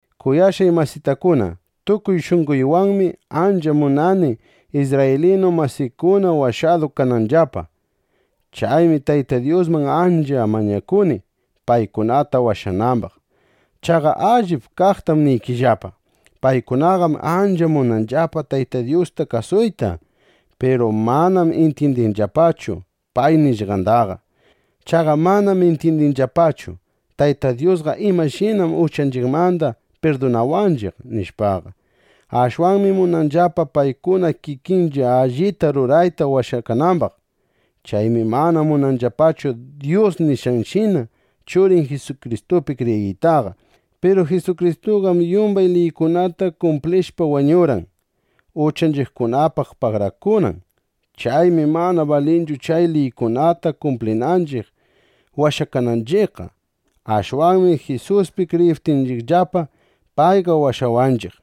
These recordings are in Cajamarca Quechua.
Kuyashqay masitakuna, tukuy shunqoywanmi ancha munani, isrraylinu masiykuna washadu kananllapa. Chaymi Tayta Dyusman ancha mañakuni, paykunata washanambaq. Chaqa allip kaqtam niykillapa: Paykunaqam ancha munanllapa Tayta Dyusta kasuyta. Piru manam intyindinllapachu pay nishqandaqa. Chaqa manam intyindinllapachu: Tayta Dyusqa imashinam uchanchiqmanda pirdunawanchiq, nishpaqa. Ashwanmi munanllapa paykuna kikinlla allita rurayta washakanambaq. Chaymi mana munanllapachu Dyus nishqanshina Churin Jisukristupi kriyiytaqa. Piru Jisukristuqam yumbay liykunata kumplishpa, wañurqan, uchanchiqkunapaq pagarakunan. Chaymi manana balinchu chay liykunata kumplinanchiq washakananchiqqa. Ashwanmi Jisuspi kriyiptinchiqllapa, payqa washawanchiq.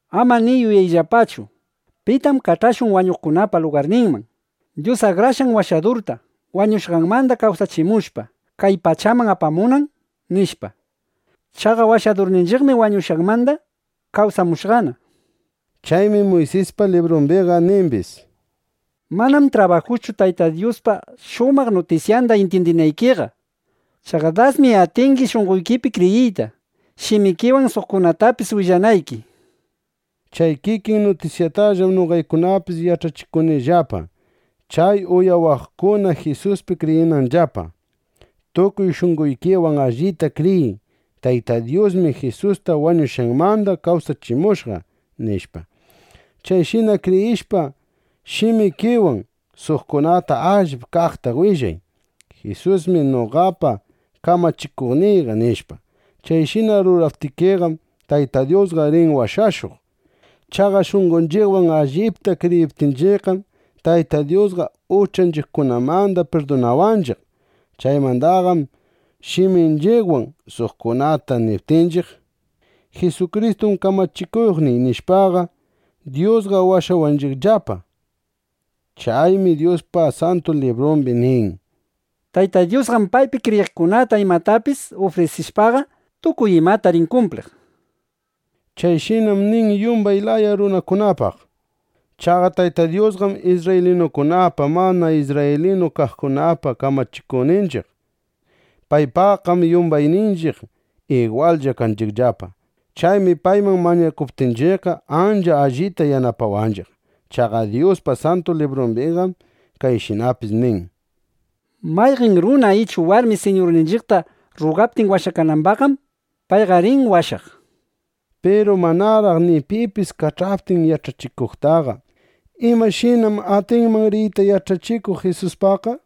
Ama ni yuyayllapachu: ¿Pitam kach'ashun wañuqkunapa lugarninman, Dyus Akrashqan Washadurta wañushqanmanda kawsachimushpa, kay pachaman apamunan? nishpa. (Chaqa Washadurninchiqmi wañushqanmanda kawsamushqana.)” Chaymi Muysispa librumbiqa nimbis: “Manam trabajuschu Tayta Dyuspa shumaq nutisyanda intyindinaykiqa. Chaqa dasmi atingi shunqoykipi kriyiyta, shimikiwan suqkunatapis willanayki”, nishpa. Chay kikin nutisyatallam noqaykunapis yach'achikunillapa, chay uyawaqkuna Jisuspi kriyinanllapa. Tukuy shunqoykiwan allita kriyiy: Tayta Dyusmi Jisusta wañushqanmanda kawsachimushqa, nishpa. Chayshina kriyishpa, shimikiwan suqkunata allip kaqta willay: “Jisusmi noqapa kamachikuqniyqa”, nishpa. Chayshina ruraptikiqam, Tayta Dyusqa rin washashuq. Chaqa shunqonchiqwan allipta kriyiptinchiqqam, Tayta Dyusqa uchanchiqkunamanda pirdunawanchiq. Chaymandaqam shiminchiqwan suqkunata niptinchiq: “Jisukristum kamachikuqniy”, nishpaqa, Dyusqa washawanchiqllapa. Chaymi Dyuspa Santu Librumbi nin: “Tayta Dyusqam paypi kriyiqkunata imatapis ufrisishpaqa, tukuy imata rin kumpliq”, nishpa. Chayshinam nin yumbay laya runakunapaq. Chaqa Tayta Dyusqam isrraylinukunapa, mana isrraylinu kaqkunapa kamachikuqninchiq. Paypaqqam yumbayninchiq igwallla kanchiqllapa. Chaymi payman mañakuptinchiqqa, ancha allita yanapawanchiq. Chaqa Dyuspa Santu Librumbiqam kayshinapis nin: “Mayqan runa ichu warmi Siñurninchiqta rrugaptin washanambaqqam, payqa rin washaq”, nishpa. Piru manaraq ni pipis kach'aptin yach'achikuqtaqa, ¿imashinam atinman riyta yach'achikuq Jisuspaqqa?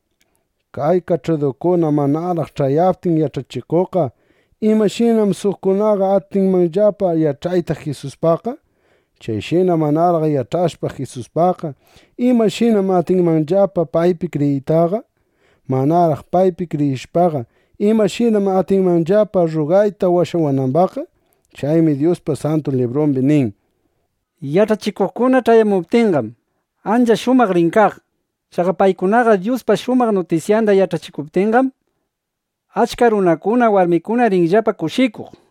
Chay kach'adukuna manaraq ch'ayaptin yach'achikuqqa, ¿imashinam suqkunaqa atinmanllapa yach'ayta Jisuspaqqa? Chayshina manaraq yach'ashpa Jisuspaqqa, ¿imashinam atinmanllapa paypi kriyiytaqa? Manaraq paypi kriyishpaqa, ¿imashinam atinmanllapa rrugayta washanambaqqa? Chaymi Dyuspa Santu Librumbi nin: “Yach'achikuqkuna ch'ayamuptinqam, ancha shumaq rin kaq. Chaqa paykunaqa Dyuspa shumaq nutisyanda yach'achikuptinqam, achka runakuna, warmikuna rinllapa kushikuq”, nishpa.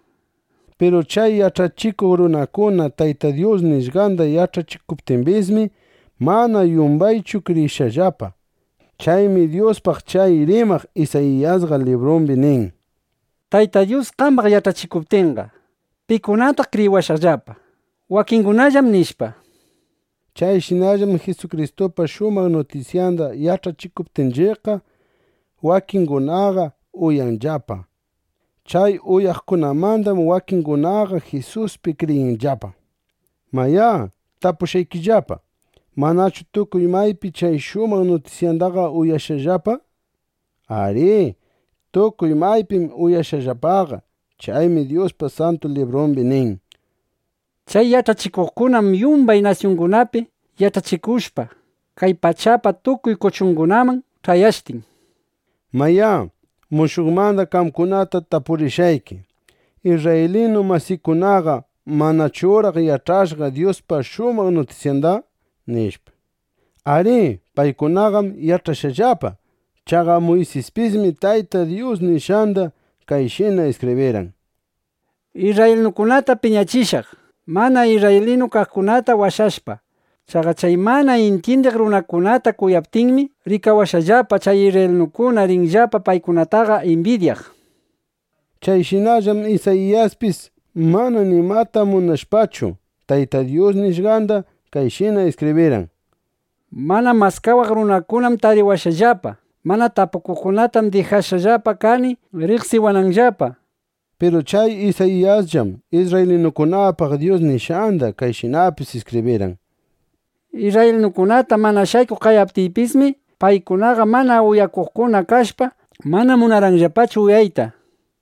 Piru chay yach'achikuq runakuna Tayta Dyus nishqanda yach'achikuptimbismi, mana yumbaychu kriyishqallapa. Chaymi Dyuspaq chay rimaq Isayiyasqa librumbi nin: “Tayta Dyus, qambaq yach'achikuptiyqa, ¿pikunataq kriyiwashqallapa? (Wakingunallám)”, nishpa. Chayshinallam Jisukristupa shumaq nutisyanda yach'achikuptinchiqqa, wakingunaqa uyanllapa. Chay uyaqkunamandam, wakinningunaqa Jisuspi kriyinllapa. Mayá, tapushqaykillapa: ¿Manachu tukuy maypi chay shumaq nutisyandaqa uyashqallapa? Arí. Tukuy maypim uyashqallapaqa. Chaymi Dyuspa Santu Librumbi nin: Chay yach'achikuqkunam yumbay nasyungunapi yach'achikushqa, kay pachapa tukuy kuchungunakaman ch'ayashtin, nishpa. Mayá, mushuqmanda qamkunata tapurishqayki: ¿Isrraylinu masiykunaqa manachuraq yach'ashqa Dyuspa shumaq nutisyanda? nishpa. Arí, paykunaqam yach'ashqallapa. Chaqa Muysispismi Tayta Dyus nishqanda kayshina iskibrirqan: Isrraylinukunatam piñachishaq, mana isrraylinu kaqkunata washashpa. Chaqa chay mana intyindiq runakunata kuyaptiymi, rikawashpallapa, chay isrraylinukuna rinllapa paykunataqa imbidyaq, nishpa. Chayshinallam Isayiyaspis mana nimata manchashpachu, Tayta Dyus nishqanda kayshina iskibrirqan: Mana maskawaq runakunam tariwashqallapa; mana tapukuqkunatam dijashqa kani riqsiwananllapa, nishpa. Piru chay Isayiyasllam isrraylinukunapaq Dyus nishqanda kayshinapis iskibrirqan: Isrraylinukunata mana shaykuq qayaptiypismi, paykunaqa mana uyakuqkuna kashpa, mana munarqanllapachu uyawayta, nishpa.